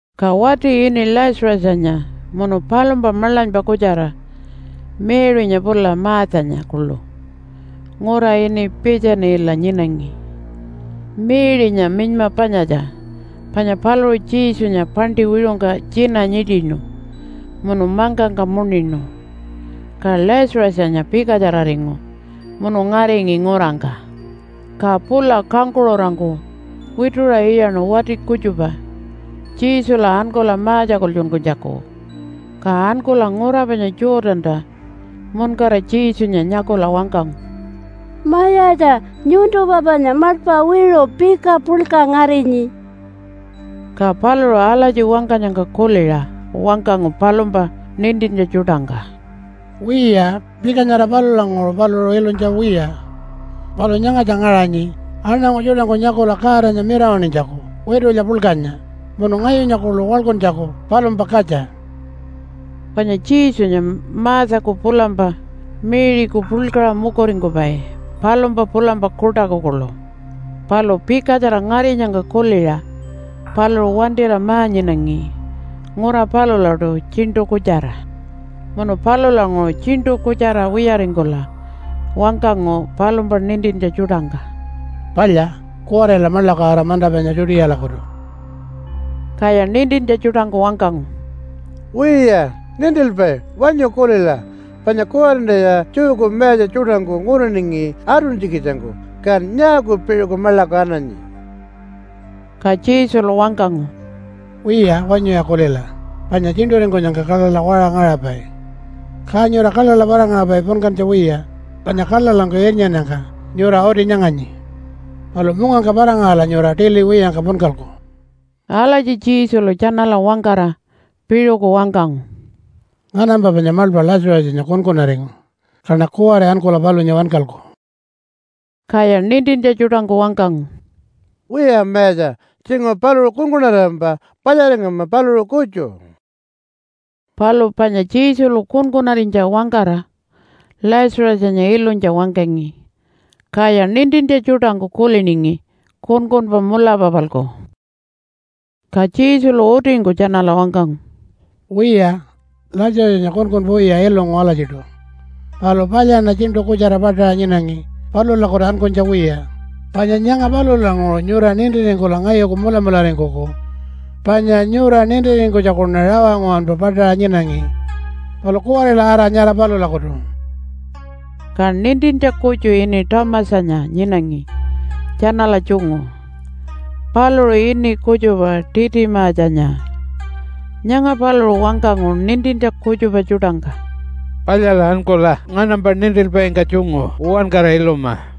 Ka wati ini Lazarusanya munu palumpa maḻanypa kutjara Mary-nya pula Marthanya kuḻu ngura ini Piitjanila nyinangi. (Mary-nya minyma panyatja, panya paluṟu Jesunya paṉṯi wiṟungka tjina nyiṯinu munu mangkangka muṉinu.) Ka Lazarusanya pikatjararingu munu ngaringi ngurangka. Ka pula kangkuṟurangku wituṟa iyaṉu wati kutjupa Jesula ankula ma-tjakultjunkunytjaku. Ka ankula ngura panya Jordanta muṉkara Jesunya nyakula wangkangu, “Mayatja, nyuntumpa panya maḻpa wiṟu pika puḻka ngarinyi.” Ka paluṟu alatji wangkanyangka kuliṟa wangkangu palumpa nintintja tjuṯangka, “Wiya, pika nyara palulanguṟu paluṟu ilunytja wiya. Palu nyangatja ngaṟanyi aṉangu tjuṯangku nyakula Godanya mirawaṉinytjaku witulya puḻkanya munu ngayunya kuḻu waḻkuntjaku palumpa katja.” Panya Jesunya Marthaku pulampa Mary-ku puḻkaṟa mukuringkupai palumpa pulampa kuṯaku kuḻu, palu pikatjara ngarinyangka kuliṟa paluṟu wantira ma-nyinangi ngura palulaṯu tjiṉṯu kutjara. Munu palulanguṟu tjiṉṯu kutjara wiyaringkula wangkangu palumpa nintintja tjuṯangka, “Palya, kuwarila maḻaku ara manta panya Judealakutu.” Kaya nintintja tjuṯangku wangkangu, “Wiya, Nintilpai wanyu kulila, panya kuwarintaya Jewku mayatja tjuṯangku nguriningi atuntjikitjangku, kan nyaaku piṟuku maḻaku ananyi?” Ka Jesulu wangkangu, “Wiya, wanyuya kulila, panya tjiṉṯuringkunyangka kaḻaḻa waṟa ngaṟapai. Ka nyura kaḻaḻa para-ngaṟapai punkantja wiya, panya kaḻaḻangku irnyannyangka nyura uti nyanganyi. Palu mungangka para-ngaṟala nyura tili wiyangka punkalku.” Alatji Jesulu tjanala wangkara piṟuku wangkangu, “Nganampa panya maḻpa Lazarusanya kunkunaringu, kaṉa kuwari ankula palunya wankalku.” Kaya nintintja tjuṯangku wangkangu, “Wiya Mayatja, tjinguṟu paluṟu kunkunarirampa palyaringama paluṟu kutju.” Palu panya Jesulu kunkunarinytja wangkara Lazarusanya ilunytja wangkangi, kaya nintintja tjuṯangku kuliningi kunkunpa mulapa-palku. Ka Jesulu utingku tjanala wangkangu, “Wiya, Lazarusanya kunkunpa wiya ilungu alatjiṯu. Palu palyaṉa tjiṉṯu kutjara paṯaṟa nyinangi palulakutu ankunytja wiya, panya nyanga palulanguṟu nyura nintiringkula ngayuku mulamularingkuku. Panya nyura nintiringkunytjakuṉa rawa nguwanpa paṯaṟa nyinangi. Palu kuwarila ara nyara palulakutu.” Ka nintintja kutju ini Thomasanya nyinangi tjanala tjungu. Paluṟu ini kutjupa Titimatjanya. Nyanga paluṟu wangkangu nintintja kutjupa tjuṯangka, “Palyala ankula nganampa nintilpaingka tjungu uwankara iluma.”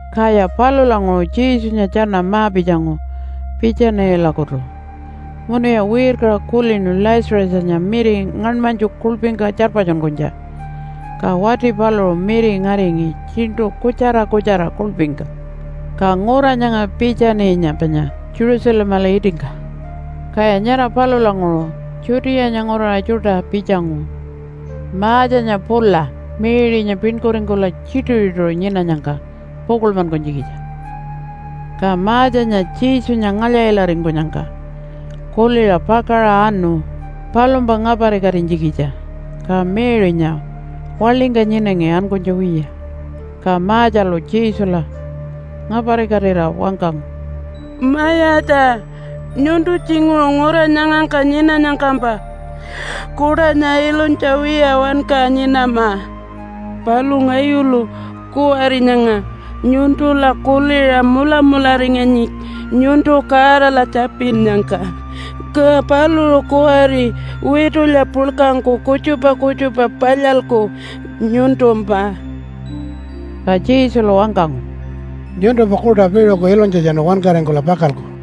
Kaya palulanguṟu Jesunya tjana ma-pitjangu Piitjanilakutu, munuya wirkaṟa kulinu Lazarusanya miri ngaṉmanytju kuḻpingka tjarpatjunkunytja. Ka wati paluṟu miri ngaringi tjiṉṯu kutjara kutjara kuḻpingka. Ka ngura nyanga Piitjaninya panya Jerusalemala itingka, kaya nyara palulanguṟu Judeanya nguraṟa tjuṯa pitjangu Marthanya pula Mary-nya piṉkuringkula tjituṟu-tjituṟu nyinanyangka pukuḻmankunytjikitja. Ka Marthanya Jesunya ngalya-ilaringkunyangka kuliṟa pakaṟa anu palumpa ngaparikatinytjikitja, ka Mary-nya waḻingka nyinangi ankunytja wiya. Ka Marthalu Jesula ngaparikatira wangkangu, “Mayatja, nyuntu tjinguṟu ngura nyangangka nyinanyangkampa Kuṯanya ilunytja wiya wanka nyinama. Palu ngayulu kuwari nyanga nyuntula kuliṟa mulamularinganyi nyuntu Godala tjapinnyangka, ka paluṟu kuwari witulya puḻkangku kutjupa kutjupa palyalku nyuntumpa.” Ka Jesulu wangkangu, “Nyuntumpa kuṯa piṟuku ilunytjatjanu wankaringkula pakalku.”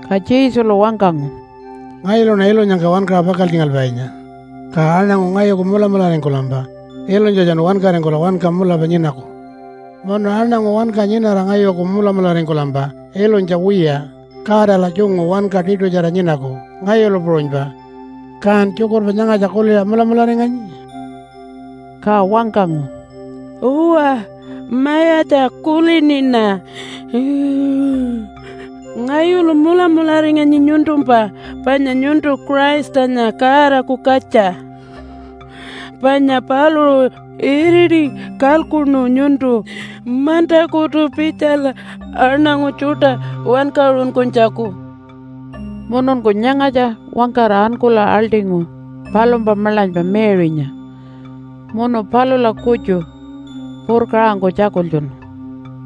Ka Jesulu wangkangu, “Ngayuluṉa ilunyangka wankaṟa pakaltjingalpainya, ka aṉangu ngayuku mulamularingkulampa ilunytjatjanu wankaringkula wanka mulapa nyinaku. Munu aṉangu wanka nyinara ngayuku mulamularingkulampa ilunytja wiya Godala tjungu wanka tiṯutjara nyinaku ngayulu puṟunypa. Kan tjukurpa nyangatja kuliṟa mulamularinganyi?” Ka wangkangu, “Uwa Mayatja, kuliniṉa. Ngayulu mulamularinganyi nyuntumpa panya nyuntu Christanya Godaku katja, panya paluṟu iriti kalkuṉu nyuntu mantakutu pitjala aṉangu tjuṯa wankaṟunkunytjaku.” Mununku nyangatja wangkara ankula aḻṯingu palumpa maḻanypa Mary-nya munu palula kutju purkaṟangku tjakultjunu,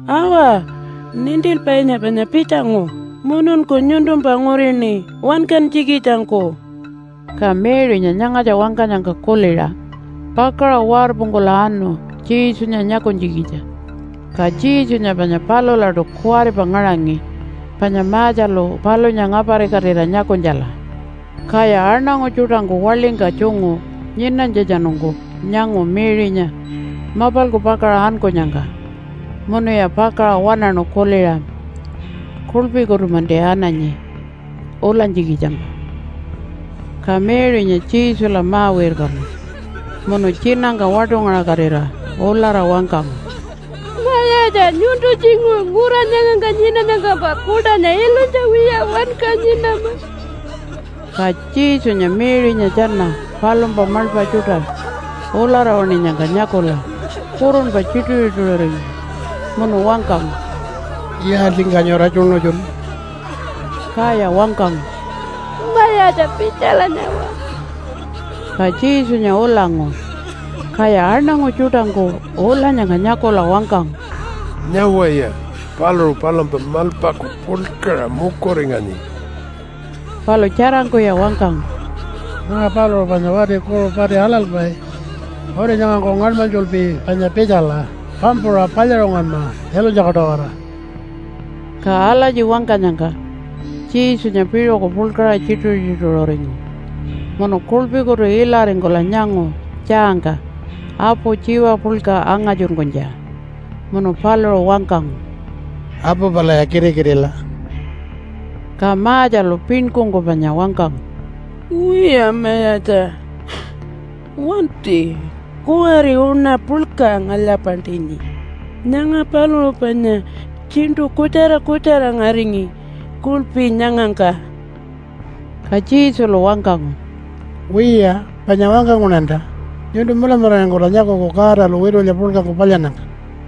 “Awa! Nintilpainya panya pitjangu mununku nyuntumpa ngurini wangkanytjikitjangku.” Ka Mary-nya nyangatja wangkanyangka kuliṟa pakaṟa warpungkula anu Jesunya nyakunytjikitja. Ka Jesunya panya palulaṯu kuwaripa ngaṟangi panya Marthalu palunya ngaparikatira nyakunytjala. Kaya aṉangu tjuṯangku waḻingka tjungu nyinanytjatjanungku nyangu Mary-nya mapalku pakaṟa ankunyangka munuya pakaṟa waṉaṉu kuliṟa, “Kuḻpikutu-manti ananyi ulanytjikitjampa.” Ka Mary-nya Jesula ma-wirkanu munu tjinangka waṯungaṟakatira ulara wangkangu, “Mayatja, nyuntu tjinguṟu ngura nyangangka nyinanyangkampa Kuṯanya ilunytja wiya wanka nyinama.” Ka Jesunya Mary-nya tjana palumpa maḻpa tjuṯa ulara waṉinyangka nyakula kurunpa tjituṟu-tjituṟuringu. Munu wangkangu, “Yaaltjingka nyura tjuṉutjunu?” Kaya wangkangu, “Mayatja, pitjala nyawa.” Ka Jesunya ulangu. Kaya aṉangu tjuṯangku ulanyangka nyakula wangkangu, “Nyawaya, paluṟu palumpa maḻpaku puḻkaṟa mukuringanyi.” Palu tjarangkuya wangkangu, “Nyanga paluṟu panya wati kuṟu pati aḻalpai. Uti nyangangku ngaṉmanytjulpi panya pitjala pampuṟa palyaṟungunma ilunytjaku-tawara.” Ka alatji wangkanyangka Jesunya piṟuku puḻkaṟa tjituṟu-tjituṟuringu, munu kuḻpikutu ilaringkula nyangu tjaangka apu tjiwa puḻka angatjunkunytja. Munu paluṟu wangkangu, “Apu palaya kitikitila.” Ka Marthalu piṉkungku panya wangkangu, “Wiya Mayatja, wanti. Kuwari uṉa puḻka ngalya-paṉṯinyi. Nyanga paluṟu panya tjiṉṯu kutjara kutjara ngaringi kuḻpi nyangangka.” Ka Jesulu wangkangu, “Wiya, panya wangkanguṉanta, nyuntu mulamularingkula nyakuku Godalu witulya puḻkangku palyannyangka.”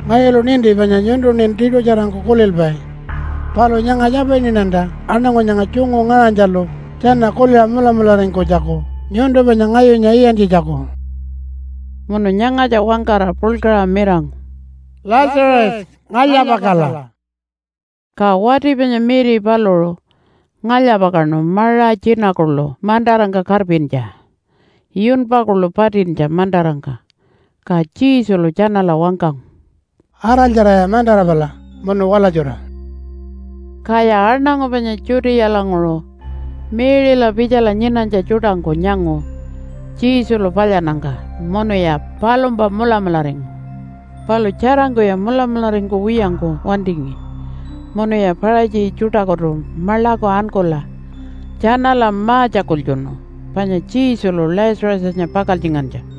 Ngayulu ninti panya nyuntuṉin tiṯutjarangku kulilpai. Palu nyanga tjapiniṉanta aṉangu nyanga tjungu ngaṟanytjalu tjana kuliṟa mulamularingkunytjaku nyuntu panya ngayunya iyantjitjaku.” Munu nyangatja wangkara puḻkaṟa mirangu, “Lazarus! Ngalya-pakala!” Ka wati panya miri paluṟu ngalya-pakaṉu maṟa tjina kuḻu mantarangka karpintja, yunpa kuḻu patintja mantarangka. Ka Jesulu tjanala wangkangu, “Araltjaraya mantara pala munu walatjura.” Kaya aṉangu panya Judealanguṟu Mary-la pitjala nyinanytja tjuṯangku nyangu Jesulu palyannyangka munuya palumpa mulamularingu. Palu tjarangkuya mulamularingkuwiyangku wantingi munuya Paṟatji tjuṯakutu maḻaku ankula tjanala ma-tjakultjunu panya Jesulu Lazarusanya pakaltjingantja.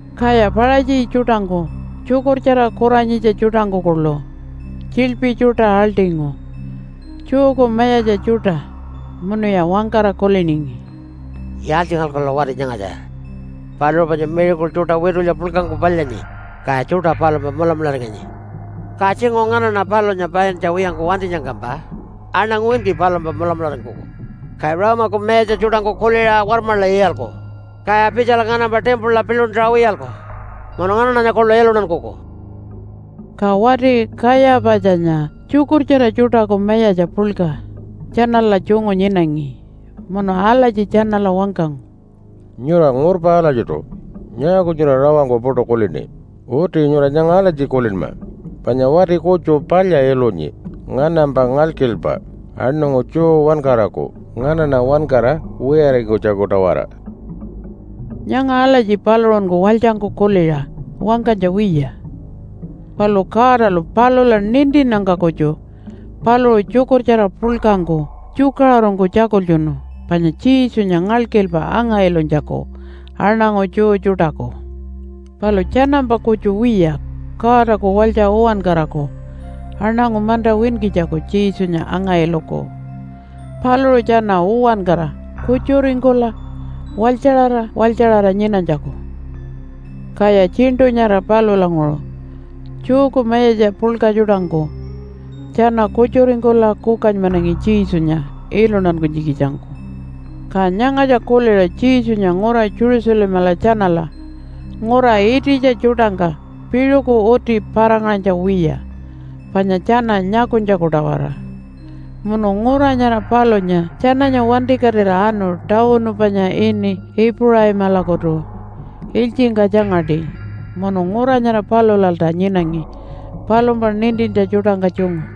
Kaya Paṟatji tjuṯangku tjukurtjara kuranyitja tjuṯangku kuḻu tjiḻpi tjuṯa aḻṯingu Jewku mayatja tjuṯa, munuya wangkara kuliningi, “Yaaltjingalkula wati nyangatja? Paluṟu panya miracle tjuṯa witulya puḻkangku palyaṉi, kaya tjuṯa palumpa mulamularinganyi. Ka tjinguṟu nganaṉa palunya paintja wiyangku wantinyangkampa aṉangu winki palumpa mulamularingkuku, ka Rome-aku mayatja tjuṯangku kuliṟa warmaḻa iyalku, kaya pitjala nganampa timpula piḻuntaṟa wiyalku, munu nganaṉanya kuḻu iluntankuku.” Ka wati Kayapatjanya tjukurtjara tjuṯaku mayatja puḻka tjanala tjungu nyinangi munu alatji tjanala wangkangu, “Nyura ngurpa alatjiṯu. Nyaaku nyura rawangku puṯu kulini? Uti nyura nyanga alatji kulinma panya wati kutju palya ilunyi nganampa ngalkilpa aṉangu Jew uwankaraku, nganaṉa uwankara wiyaringkunytjaku-tawara.” Nyanga alatji paluṟunku walytjangku kuliṟa wangkanytja wiya. Palu Godalu palula nintinnyangka kutju paluṟu tjukurtjara puḻkangku tjukaṟurungku tjakultjunu panya Jesunya ngalkilpa anga-ilunytjaku aṉangu Jew tjuṯaku. Palu tjanampa kutju wiya Godaku walytja uwankaraku aṉangu manta winkitjaku Jesunya anga-iluku, paluṟu tjana uwankara kutjuringkula walytjaṟara walytjaṟara nyinanytjaku. Kaya tjiṉṯu nyara palulanguṟu Jewku mayatja puḻka tjuṯangku tjana kutjuringkula kukanymanangi Jesunya iluntankunytjikitjangku. Ka nyangatja kuliṟa Jesunya ngura Jerusalemala tjanala ngura ititja tjuṯangka piṟuku uti para-ngaṟanytja wiya panya tjana nyakunytjaku-tawara. Munu ngura nyara palunya tjananya wantikatira anu tawunu panya ini Ipuṟaimalakutu ilytjingka tjangaṯi, munu ngura nyara palulalta nyinangi palumpa nintintja tjuṯangka tjungu.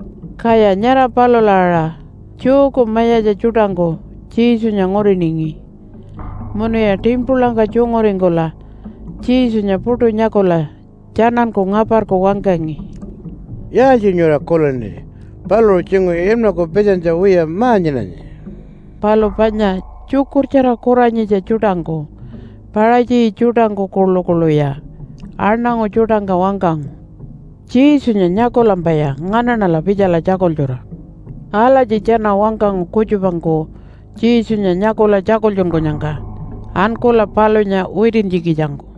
Kaya nyara palula aṟa Jewku mayatja tjuṯangku Jesunya nguriningi munuya timpulangka tjunguringkula Jesunya puṯu nyakula tjananku ngaparku wangkangi, “Yaaltji nyura kulini? Paluṟu tjinguṟu inmaku pitjanytja wiya ma-nyinanyi.” Palu panya tjukurtjara kuranyitja tjuṯangku Paṟatji tjuṯangku kuḻukuḻuya aṉangu tjuṯangka wangkangu, “Jesunya nyakulampaya nganaṉala pitjala tjakultjura.” Alatji tjana wangkangu kutjupangku Jesunya nyakula tjakultjunkunyangka ankula palunya witintjikitjangku.